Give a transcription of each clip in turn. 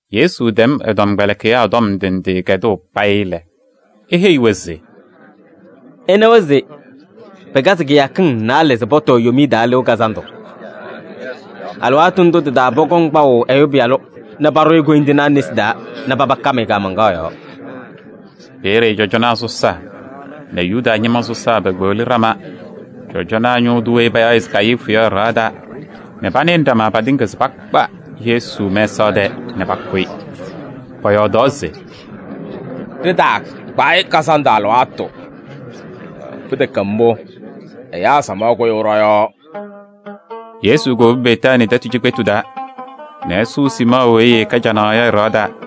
Yesu tɛm ɛ-tɔmkpɛlɩkɩyaa tɔm ndɩ ndɩ kɛdʋʋ payɩ lɛ, eheyi-wɛ se: “Ɩnawa se pɩkazɩ kɩyakɩŋ naalɛ se pɔtɔɔ Yomiye Taa Lɩʋ Kazandʋ. Alɩwaatʋ ndʋ tɩ-taa pɔkɔŋ kpaʋ Ɛyʋ Pɩyalʋ nɛ paɖʋzɩ-ɩ koyindinaa nesi taa nɛ paba kam-ɩ kaamaŋkaɣ yɔɔ.” Peeye cɔjɔnaa sɔsaa nɛ Yuda ñɩma sɔsaa pekpeɣli ɖama cɔjɔnaa ñʋʋ tʋ weyi payaɣ se Kayifu yɔ, ɛ-ɖɩɣa taa nɛ panɩnɩ ɖama patɩŋa se pakpa Yesu mɛsaɣ tɛɛ nɛ pakʋ-ɩ. Pɔyɔɔdaɣ se: “Ɖɩtaakpa-ɩ kazandʋ alɩwaatʋ. Pɩtɛkɛ mbʋ, ɛyaa samaɣ kʋyʋʋ ɖɔ-yɔɔ.” Yesu kowobi Betaanii tɛtʋ cikpetu taa nɛ ɛsʋʋ Siimɔɔ weyi ɛɛkɛ canaɣ yɔ ɛ-ɖɩɣa taa.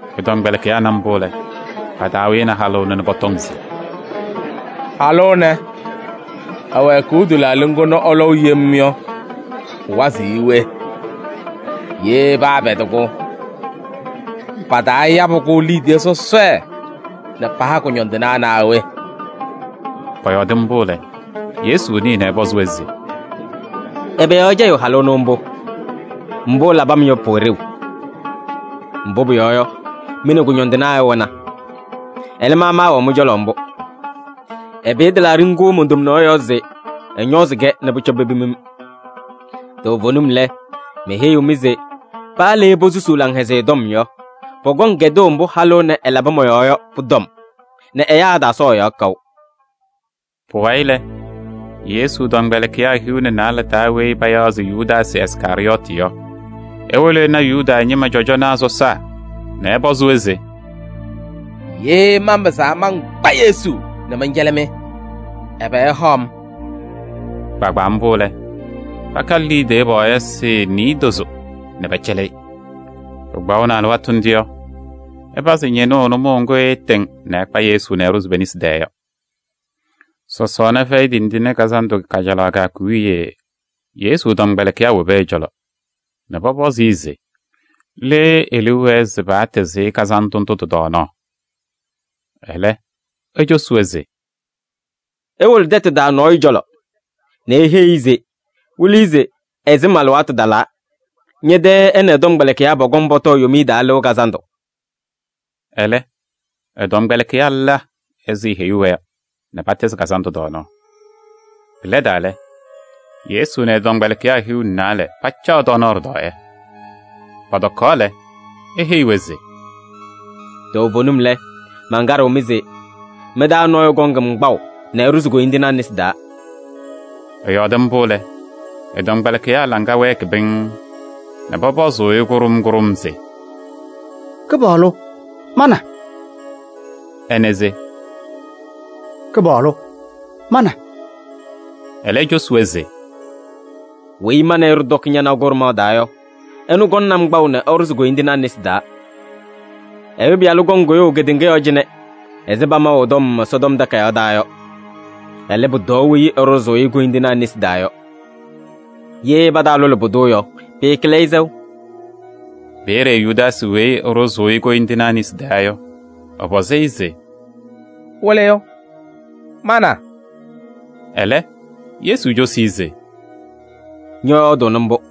Ɛ-tɔmkpɛlɩkɩyaa na mbʋ lɛ, pa-taa wɩnɩ halʋ ɛnʋ nɛ pɔtɔŋ se: “Halʋ ɛnɛ, ɛwɛɛkʋʋ tɩlaaɖɩ ŋgʋ nɛ ɛlɔʋ yem yɔ, pʋwazɩɣ-ɩ we? Ye paapɛdɩ-kʋ, pataayabɩ-kʋ liidiye sɔsɔɖɛ nɛ paha kʋñɔndɩnaa naa we?” Pɔyɔɔdɩ mbʋ lɛ, Yesu nɩɩ nɛ ɛpɔzɩ-wɛ se: “Ɛbɛ yɔɔ ɩcɛyɩɣ halʋ ɛnʋ mbʋ? Mbʋ ɛlabɩ-m yɔ, pʋwɛ ɖeu. Mbʋ pʋyɔɔ yɔ, mɩ nɛ kʋñɔndɩnaa ɩwɛna. Ɛlɛ, ma maawɛɣ mɩ-cɔlɔ mbʋ. Ɛpɩyɩ tɩlaaɖɩ ŋgʋ mon-tomnaɣ yɔɔ se ɛñɔɔzɩ-kɛ nɛ pʋcɔ pepim-m. Toovenim lɛ, meheyiɣ-mɩ se: paa le posusuu Laŋhɛzɩyɛ Tɔm yɔ, pɔkɔŋ kɛdʋʋ mbʋ halʋ ɛnɛ ɛlabɩ mɔ-yɔɔ yɔ pʋ-tɔm nɛ ɛyaa ɛtaasɔɔ ɛ-yɔɔ kaʋ.” Pʋwayɩ lɛ, Yesu tɔmkpɛlɩkɩyaa hiu nɛ naalɛ taa weyi payaɣ se Yudaasɩ Iskarɩyɔɔtɩ yɔ, ewolo ɛna Yuda ñɩma cɔjɔnaa sɔsaa nɛ ɛpɔzɩ-wɛ se: “Ye manpɩzaa mankpa Yesu nɛ mɛncɛlɩ-mɩ, ɛbɛ ɩhaɣ-m?” Kpaagbaa mbʋ lɛ, pakalɩ liidiye pɔɔyɩsɩ niidozo nɛ pɛcɛlɩ-ɩ. Pɩkpaɣʋnɩ alɩwaatʋ ndʋ yɔ, ɛpazɩ ñɩnʋʋ nʋmɔʋ ŋgʋ ɛɛtɩŋ nɛ ɛkpa Yesu nɛ ɛɖʋzɩ pe-nesi taa yɔ. Sɔsɔɔna Fɛyɩ Tindine Kazandʋ kajalaɣ kɩyakʋ wiye Yesu tɔmkpɛlɩkɩyaa wobi ɛ-cɔlɔ nɛ pɔpɔzɩ-ɩ se le e-liu wɛɛ se patɩzɩ-ɩ kazandʋ ndʋ tɩ-tɔɔnaɣ? Ɛlɛ, ecosi-wɛ se: “Iwolo tɛtʋ taa nɔɔyʋ cɔlɔ nɛ iheyi-i se Wɩlɩyʋ se ɛ-sɩm alɩwaatʋ talaa, ñɛ-tɛ ɛ nɛ ɛ-tɔmkpɛlɩkɩyaa pɔkɔŋ pɔtɔɔ Yomiye Taa Lɩʋ Kazandʋ.” Ɛlɛ ɛ-tɔmkpɛlɩkɩyaa la ɛzɩ eheyuu-wɛ yɔ nɛ patɩzɩ kazandʋ tɔɔnaɣ. Pɩlɛdaa lɛ, Yesu nɛ ɛ-tɔmkpɛlɩkɩyaa hiu nɛ naalɛ pacaɣ tɔɔnaɣ ɖɩtɔɔyɛ. Pɔtɔkaɣ lɛ, eheyi-wɛ se: “Toovenim lɛ, mankaɖɩɣ-mɩ se: mɩ-taa nɔɔyʋ kɔŋ-m kpaʋ nɛ ɛɖʋzɩ koyindinaa nesi taa.” Ɛyɔɔdɩ mbʋ lɛ, ɛ-tɔmkpɛlɩkɩyaa laŋa wɛɛkɩ pɩŋŋ nɛ pɔpɔzʋʋ-ɩ kʋɖʋm kʋɖʋm se: “Kɩpaɣlʋ! Ma na?” Ɛnɛ se: “Kɩpaɣlʋ! Ma na?” Ɛlɛ ecosi-wɛ se: “Weyi ma nɛ ɩ ɖɩtɔkɩ ñanaɣ kʋɖʋmaɣ taa yɔ, ɛnʋ kɔŋnɩ-m kpaʋ nɛ ɛɖʋzɩ koyindinaa nesi taa. Ɛyʋ Pɩyalʋ kɔŋ kʋyʋʋ kedeŋa yɔɔ cɩnɛ ɛzɩ pamaʋ ɛ-tɔm Ɛsɔtɔm Takayaɣ taa yɔ. Ɛlɛ, pʋtɔɔ weyi ɛɖʋzʋʋ-ɩ koyindinaa nesi taa yɔ! Ye pataalʋlɩ pʋdʋ yɔ, pɩɩkɩlɩ-ɩ sɛʋ.” Peeye Yudaasɩ weyi ɛɖʋzʋʋ-ɩ koyindinaa nesi taa yɔ, ɛpɔzɩ-ɩ se: “Wɩlɩyʋ! Ma na?” Ɛlɛ, Yesu cosi-i se: “Ñɔyɔɔdʋʋnɩ mbʋ.”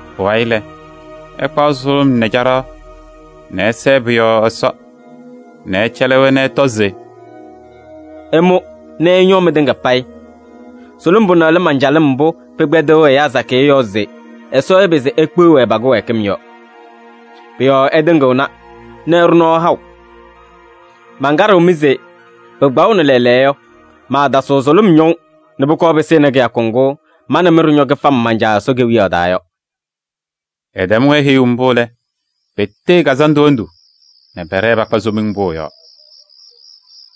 Pʋwayɩ lɛ, ɛkpaɣ sʋlʋm nɛ caɖaɣ nɛ ɛsɛɛ pʋ-yɔɔ Ɛsɔ nɛ ɛcɛlɩ-wɛ nɛ ɛtɔ se: “Ɩmʋ nɛ ɩñɔɔ mɩtɩŋa payɩ. Sʋlʋm pʋnɛ lɛ man-calɩm mbʋ pɩkpɛdɩɣ ɛyaa sakɩyɛ yɔɔ se Ɛsɔ ɛpɩzɩ ekpeɣ-wɛ pa-kɩwɛɛkɩm yɔ. Pʋ-yɔɔ ɛtɩŋɩɣna nɛ ɛɖʋ nɔɔ haʋ. Mankaɖɩɣ-mɩ se pɩkpaɣʋnɩ lɛɛlɛɛyɔ yɔ, maatasɩɣ sʋlʋm ñɔʋ nɛ pʋkɔɔ pɩsɩnɩ kɩyakʋ ŋgʋ ma nɛ mɩ ɖɩñɔ kɩfam man-Caa Ɛsɔ Kewiyaɣ taa yɔ.” Ɛtɛm-wɛ heyuu mbʋ lɛ, petee kazandʋ hendu nɛ pɛɖɛɛ pakpa Somiŋ Pʋʋ yɔɔ.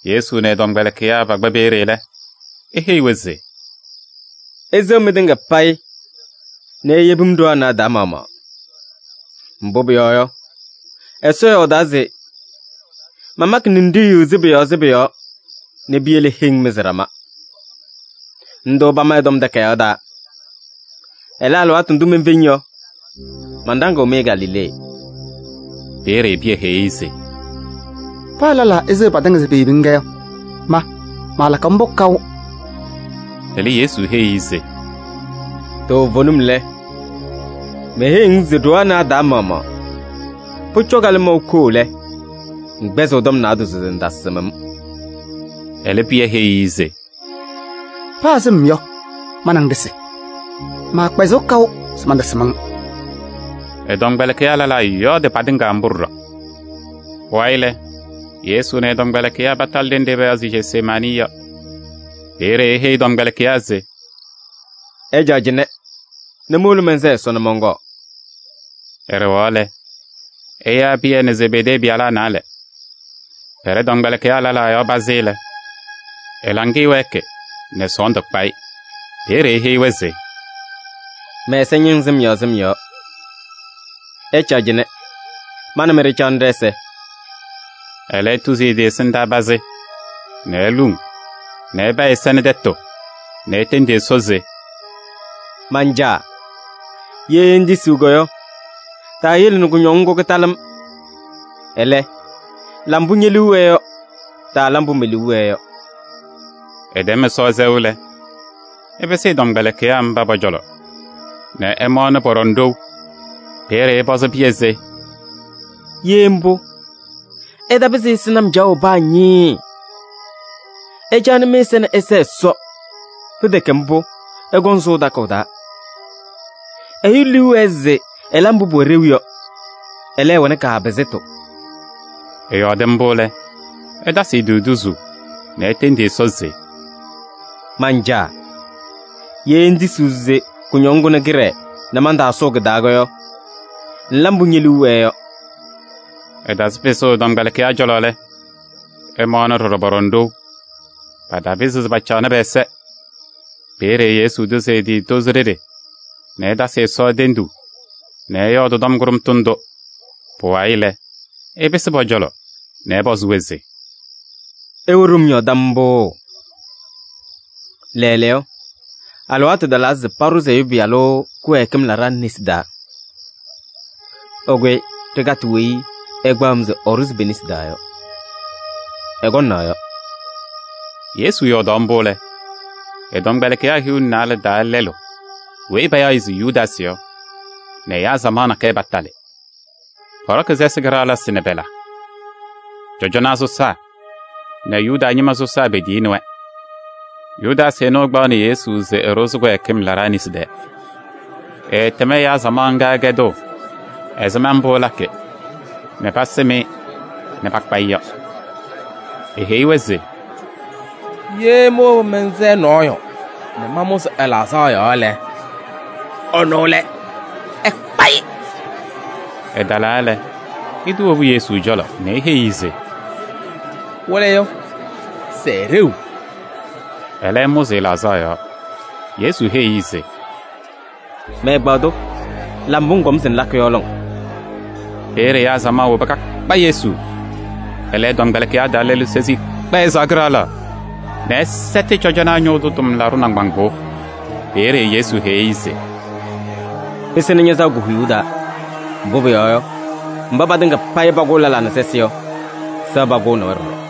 Yesu nɛ ɛ-tɔmkpɛlɩkɩyaa pakpa peeye lɛ, eheyi-wɛ se: “Iseɣ mɩtɩŋa payɩ nɛ iyebi-m ɖoo anɛ a-taa maɣmaɣ. Mbʋ pʋyɔɔ yɔ, Ɛsɔ yɔɔdaa se: ‘Mamakɩ ninɖiɣyu sɩbʋ yɔɔ sɩbʋ yɔɔ nɛ piyele heŋ mɩzɩ ɖama.’ Ndʋ pama ɛ-Tɔm Takayaɣ taa. Ɛlɛ, alɩwaatʋ ndʋ menfeŋ yɔ, manɖaŋɩɣ-mɩ Galilee.” Peeye Pɩyɛ heyi-i se: “Paa lɛlaa eseɣ patɩŋa se peyebi-ŋ yɔ, ma maalakɩ mbʋ kaʋ!” Ɛlɛ Yesu heyi-i se: “Toovenim lɛ, meheyiɣ-ŋ se ɖoo anɛ a-taa maɣmaɣ, pʋcɔ kalɩmɔʋ koo lɛ, ŋkpɛzɩɣ tɔm naadozo se ŋtasɩm-m.” Ɛlɛ, Pɩyɛ heyi-i se: “Paa sɩm yɔ, ma nɛ ŋ ɖɩsɩ, maakpɛzɩɣ kaʋ se mantasɩm-ŋ.” Ɛ-tɔmkpɛlɩkɩyaa lɛlaa yɔɔdɩ patɩŋa mbʋ ɖɔɖɔ. Pʋwayɩ lɛ, Yesu nɛ ɛ-tɔmkpɛlɩkɩyaa patalɩ ɖenɖe payaɣ se Jesemaanɩ yɔ. Peeye eheyi ɛ-tɔmkpɛlɩkɩyaa se: “Ɩcaɣ cɩnɛ nɛ mowolo mɛnsɛɛ Ɛsɔ nɛ mɔnkɔɔ.” Ɛɖɛɣaɣ lɛ, ɛyaa Pɩyɛ nɛ Zebedee pɩyalaa naalɛ. Pɛɖɛ tɔmkpɛlɩkɩyaa lɛlaa yɔɔ pazɩ lɛ, ɛ-laŋɩyɛ wɛɛkɩ nɛ sɔɔndʋ kpa-ɩ. Peeye eheyi-wɛ se: “Mɛ-ɛza ñɩŋ sɩm yɔɔ sɩm yɔɔ. Ɩcaɣ cɩnɛ, ma nɛ mɩ ɖɩcaɣnɩ ɖɛ-ɛza.” Ɛlɛ etuzi ɛ-tɩ ɛsɩndaa pazɩ nɛ eluŋ nɛ ɛpa ɛ-ɛza nɛ tɛtʋ nɛ etendi Ɛsɔ se: “Man-Caa! Ye ŋtisiɣ yɔ, taayele nɛ kʋñɔŋ ŋgʋ kɩtalɩ-m. Ɛlɛ, la mbʋ ñe-liu wɛɛ yɔ, taala mbʋ me-liu wɛɛ yɔ.” Ɛtɛm Ɛsɔ sɛʋ lɛ, ɛpɩsɩ ɛ-tɔmkpɛlɩkɩyaa mba pɔ-cɔlɔ nɛ ɛmaɣnɩ pɔɖɔŋ ɖou. Peeye ɛpɔzɩ Pɩyɛ se: “Ye mbʋ, ɩtapɩzɩ ɩsɩnɩ-m caɣʋ paa ñɩɩɩ! Ɩcaɣnɩ mɩ-ɛza nɛ ɩsɛɛ Ɛsɔ, pɩtɛkɛ mbʋ, ɩkɔŋ ɩsʋʋ takʋʋ taa. Ɛyʋ liu wɛɛ se ɛla mbʋ pʋwɛ ɖeu yɔ, ɛlɛ, ɛwɛnɩ kaapɩzɩtʋ.” Ɛyɔɔdɩ mbʋ lɛ, ɛtasɩ ɛ-tɩ tuzuu nɛ etendi Ɛsɔ se: “Man-Caa! Ye ŋŋtisiɣ se kʋñɔŋ kʋnɛ kɩɖɛɛ nɛ mantaasʋʋ kɩ-taa yɔ, ŋla mbʋ ñe-liu wɛɛ yɔ.” Ɛtasɩ pɩsʋʋ ɛ-tɔmkpɛlɩkɩyaa cɔlɔ lɛ, ɛmaɣnɩ ɖɔɖɔ pɔɖɔŋ ɖou, patapɩzɩ pacaɣnɩ pɛ-ɛza. Peeye Yesu tuzi ɛ-tɩ tozo ɖeɖe nɛ ɛtasɩ Ɛsɔ tenduu nɛ ɛyɔɔdɩ tɔm kʋɖʋmtʋ ndʋ. Pʋwayɩ lɛ, ɛpɩsɩ pɔ-cɔlɔ nɛ ɛpɔzɩ-wɛ se: “Ɩwɛ ɖom yɔɔ tam mbʋ? Lɛɛlɛɛyɔ, alɩwaatʋ talaa se paɖʋzɩ Ɛyʋ Pɩyalʋ kɩwɛɛkɩm laɖaa nesi taa. Ɩkʋyɩ ɖɩkatɩ weyi ɛkpaɣ-m se ɛɖʋzɩ pe-nesi taa yɔ! Ɛkɔŋ naɣ yɔ!” Yesu yɔɔdaɣ mbʋ lɛ, ɛ-tɔmkpɛlɩkɩyaa hiu nɛ naalɛ taa lɛlʋ weyi payaɣ-ɩ se Yudaasɩ yɔ nɛ ɛyaa samaɣ nakɛyɛ patalɩ. Pɔɖɔkɩ sɛsɩ kɩɖaɣlɩsɩ nɛ pɔla. Cɔjɔnaa sɔsaa nɛ Yuda ñɩma sɔsaa petiyini-wɛ. Yudaasɩ ɛnʋ, ɛkpaɣnɩ Yesu se ɛɖʋzɩ kɩwɛɛkɩm laɖaa nesi taa. Ɛɛtɛm ɛyaa samaɣ ŋga kɛdʋʋ ɛzɩma mbʋ ɛlakɩ nɛ pasɩm-ɩ nɛ pakpa-ɩ yɔ. Eheyi-wɛ se: “Ye mowobi mɛnsɛɛ nɔɔyʋ nɛ mamʋzɩ ɛ-laɣzaɣ yɔɔ lɛ, ɛnʋ lɛ. Ɩkpa-ɩ.” Ɛtalaa lɛ, ɛtɩwobu Yesu cɔlɔ nɛ eheyi-i se: “Wɩlɩyʋ, sɛɛ ɖeu!” Ɛlɛ ɛmʋzɩ ɛ-laɣzaɣ yɔɔ. Yesu heyi-i se: “Mɛ-ɛgbaadʋ, la mbʋ ŋkɔm se ŋlakɩ yɔ lɔŋ!” Peeye ɛyaa samaɣ woba kakpa Yesu. Ɛlɛ ɛ-tɔmkpɛlɩkɩyaa taa lɛlʋ sezi ɛkpɛɛ ɛ-sɩɣa kɩɖaɣlaɣ nɛ ɛsɛtɩ cɔjɔnaa ñʋʋ tʋ tʋmlaɖʋ nɩŋgbaŋʋʋ. Peeye Yesu heyi-i se: “Pɩsɩnɩ ña-sɩɣa ko-huyuu taa, mbʋ pʋyɔɔ yɔ, mba patɩŋa payɩ pakʋʋ lɛlaa nɛ sɛsɩ yɔ, sɩɣa pakʋʋnɩ-wɛ ɖɔɖɔ.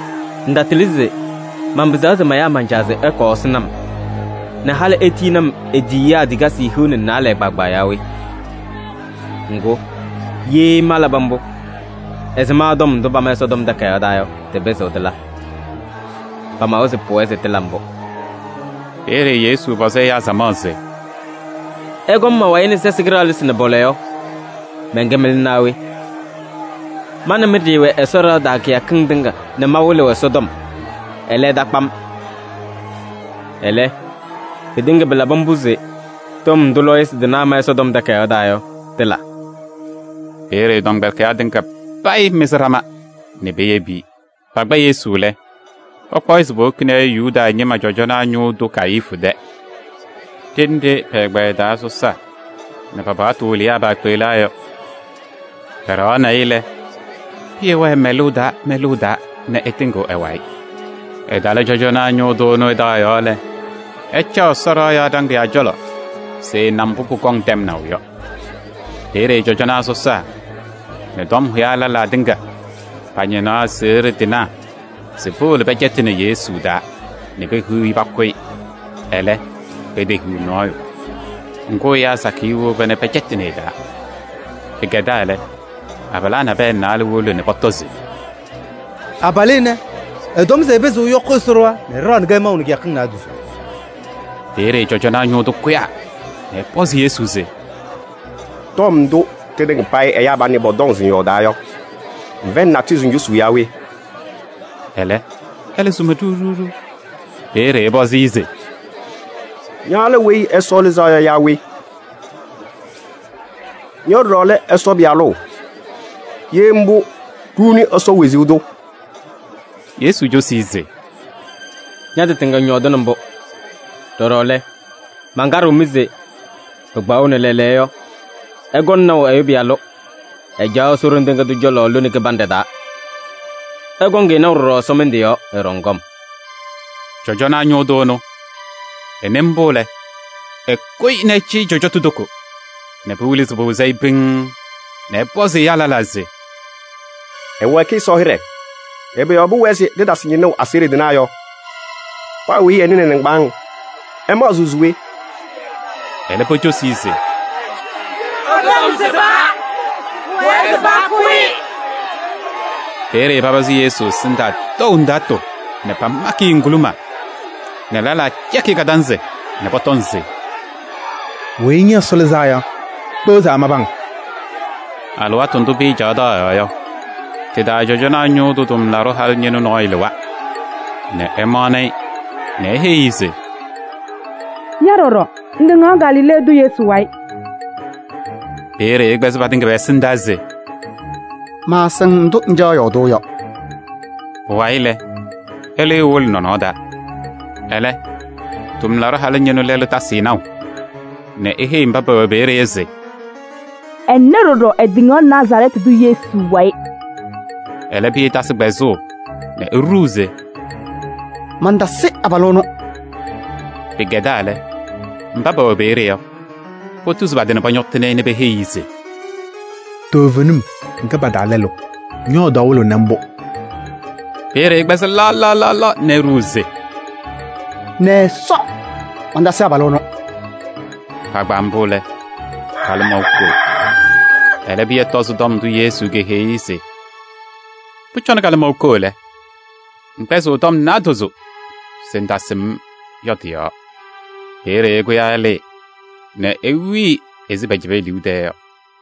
Ŋtatɩlɩ se manpɩzaɣ se mayaa man-Caa se ɛkɔɔ ɛsɩnɩ-m nɛ halɩ etiyini-m e-tiyiyaa tikasɩ hiu nɛ naalɛ kpaagbaa yaa we? Ŋgʋ, ye malabɩ mbʋ, ɛzɩma tɔm ndʋ pama Ɛsɔtɔm Takayaɣ taa yɔ, tɩpɩzɩɣ tɩla? Pamawa se pʋwɛɛ se tɩla mbʋ.” Peeye Yesu pɔzɩ ɛyaa samaɣ se: “Ɩkɔm ma-wayɩ nɛ sɛsɩ kɩɖaɣlɩsɩ nɛ pɔla yɔ, mɛnkɛ mɩlʋ naa we? Ma nɛ mɩ ɖɩɩwɛ Ɛsɔ ɖɩɣa taa kɩyakɩŋ tɩŋa nɛ mawɩlɩɣ Ɛsɔtɔm, ɛlɛ, ɩtakpa-m. Ɛlɛ, pɩtɩŋa pɩlabɩ mbʋ se tɔm ndʋ lɔɔyɩsɩ tɩnaa ma Ɛsɔtɔm Takayaɣ taa yɔ, tɩla.” Peeye ɛ-tɔmkpɛlɩkɩyaa tɩŋa payɩ mɩzɩ ɖama nɛ peyebi-i. Pakpa Yesu lɛ, pakpaɣ-ɩ se powokini-i Yuda ñɩma cɔjɔnaa ñʋʋ tʋ Kayifu tɛ ɖenɖe pɛ-ɛgbɛyɛ taa sɔsaa nɛ pa-paɣtʋ wɩlɩyaa paakpeɣlaa yɔ. Pɛɖɛɣaɣnɩ-ɩ lɛ, Pɩyɛ wɛɛ mɛlʋʋ taa mɛlʋʋ taa nɛ ɛtɩŋɩɣ ɛ-wayɩ. Ɛtalɩ cɔjɔnaa ñʋʋ tʋ ɛnʋ ɛ-taɣ yɔɔ lɛ, ɛcaɣ Ɛsɔ ɖɩɣa yɔɔ ɖaŋɩyaa cɔlɔ se ɛna mbʋ pʋkɔŋ tɛmnaʋ yɔ. Peeye cɔjɔnaa sɔsaa nɛ tɔm hʋyaa lɛlaa tɩŋa pañɩnaɣ aseɣɖe tɩnaa se powolo pɛcɛtɩnɩ Yesu taa nɛ pehiɣ-i pakʋ-ɩ. Ɛlɛ, petehiɣ nɔɔyʋ. Ŋgʋ, ɛyaa sakɩyɛ woba nɛ pɛcɛtɩnɩ ɛ-taa. Pɩkɛdaa lɛ, abalaa naalɛ nabɛyɛ wolo nɛ pɔtɔ se: “Abalʋ ɛnɛ, ɛtɔm se ɛpɩzɩɣ ɛyɔkɩ Ɛsɔ ɖɩɣa nɛ ɛɖaɣnɩ-kɛ maʋ nɛ kɩyakɩŋ naadozo.” Peeye cɔjɔnaa ñʋʋ tʋ kʋyaa nɛ ɛpɔzɩ Yesu se: “Tɔm ndʋ tɩtɩŋa payɩ ɛyaa panɛ pɔtɔŋ se ŋyɔɔdaa yɔ, ŋfɛyɩnɩ natʋyʋ se ŋcosuu yaa we?” Ɛlɛ, esuma ɖiɣ ɖiɣ. Peeye ɛpɔzɩ-ɩ se: “Ña lɛ Weyi Ɛsɔ Lɩzaa Yɔ yaa we? Ña ɖɔɖɔ lɛ Ɛsɔ Pɩyalʋ? Ye mbʋ, ɖuuni Ɛsɔ wezuu tʋ.” Yesu cosi-i se: “Ña-tɩ tɩŋa ŋyɔɔdɩnɩ mbʋ. Ɖɔɖɔ lɛ, mankaɖɩɣ-mɩ se: pɩkpaɣʋnɩ lɛɛlɛɛyɔ yɔ, ɩkɔŋ naʋ Ɛyʋ Pɩyalʋ, ɛcaɣ Ɛsɔ Ɖoŋ Tɩŋa Tʋ cɔlɔ lone kɩbanɖɛ taa. Ɩkɔŋ-ɩ naʋ ɖɔɖɔ ɛsɔmɩndʋ yɔɔ, ɛɖɔŋ kɔm.” Cɔjɔnaa ñʋʋ tʋ ɛnʋ, ɛnɩ mbʋ lɛ, ɛkʋyɩ nɛ ɛcɩyɩ ɛ-cɔjɔtʋ toko nɛ pɩwɩlɩ se pɩwɩzɩ-ɩ pɩŋŋ nɛ ɛpɔzɩ ɛyaa lɛlaa se: “Ɛwɛɛkɩ Ɛsɔ hɩɖɛ! Ɛbɛ yɔɔ pʋwɛɛ se ɖɩtasɩ ñɩnʋʋ aseɣɖe tɩnaa yɔ? Paa weyi ɛnɩnɩ ɛ-nɩŋgbaaŋ! Ɩmaɣzɩɣ se we?” Ɛlɛ pocosi se: “Ɛ-tɔm sɩba, pʋwɛɛ se pakʋ-ɩ.” Peeye papazɩ Yesu ɛsɩndaa tɔʋ ndaatʋ nɛ pamakɩ-ɩ ŋguluma nɛ lɛlaa cɛkɩ-ɩ kadanzɩ nɛ pɔtɔŋ se: “Weyi ña Ɛsɔ Lɩzaa Yɔ, kpeɣ se amabɩ-ŋ?” Alɩwaatʋ ndʋ Pɩyɛ caɣ taɣ yɔɔ yɔ, tɩ-taa cɔjɔnaa ñʋʋ tʋ tʋmlaɖʋ halʋ ñɩnʋ nɔɔyʋ lɩwa nɛ ɛmaɣnɩ-ɩ nɛ eheyi-i se: “Ña ɖɔɖɔ! Ŋtɩŋaɣ Galilee tʋ Yesu wayɩ.” Peeye ɛkpɛzɩ patɩŋa pɛ-ɛsɩndaa se: “Maasɩŋ ndʋ ŋcaɣ yɔɔdʋʋ yɔ.” Pʋwayɩ lɛ, ɛlɩɩ ewolo nɔnɔɔ taa. Ɛlɛ, tʋmlaɖʋ halʋ ñɩnʋ lɛlʋ tasɩ-ɩ naʋ nɛ eheyi mba pɛwɛ peeye yɔ se: “Ɛnɛ ɖɔɖɔ ɛtɩŋaɣ Nazarɛɛtɩ tʋ Yesu wayɩ.” Ɛlɛ, Pɩyɛ tasɩ kpɛzʋʋ nɛ eɖuu se: “Mantasɩ abalʋ ɛnʋ.” Pɩkɛdaa lɛ, mba pɛwɛ peeye yɔ, potuzi pa-tɩ nɛ pɔñɔtɩnɩ-ɩ nɛ peheyi-i se: “Toovenim, ŋkɛ pa-taa lɛlʋ: ñɔ-yɔɔdaɣ wɩlɩɣnɩ mbʋ.” Peeye ɛkpɛzaa laɣ laɣ nɛ eɖuu se: “Nɛ Ɛsɔ! Mantasɩ abalʋ ɛnʋ!” Kpaagbaa mbʋ lɛ, kalɩmɔʋ koo. Ɛlɛ Pɩyɛ tɔzɩ tɔm ndʋ Yesu keheyi-i se: “Pʋcɔ kalɩmɔʋ koo lɛ, ŋkpɛzɩɣ tɔm naadozo se ŋtasɩm-m” yɔ tɩ-yɔɔ. Peeye ɛkʋyaa ɛlɩɩ nɛ ewili ɛzɩ pɛcɛbɩ e-liu tɛɛ yɔ.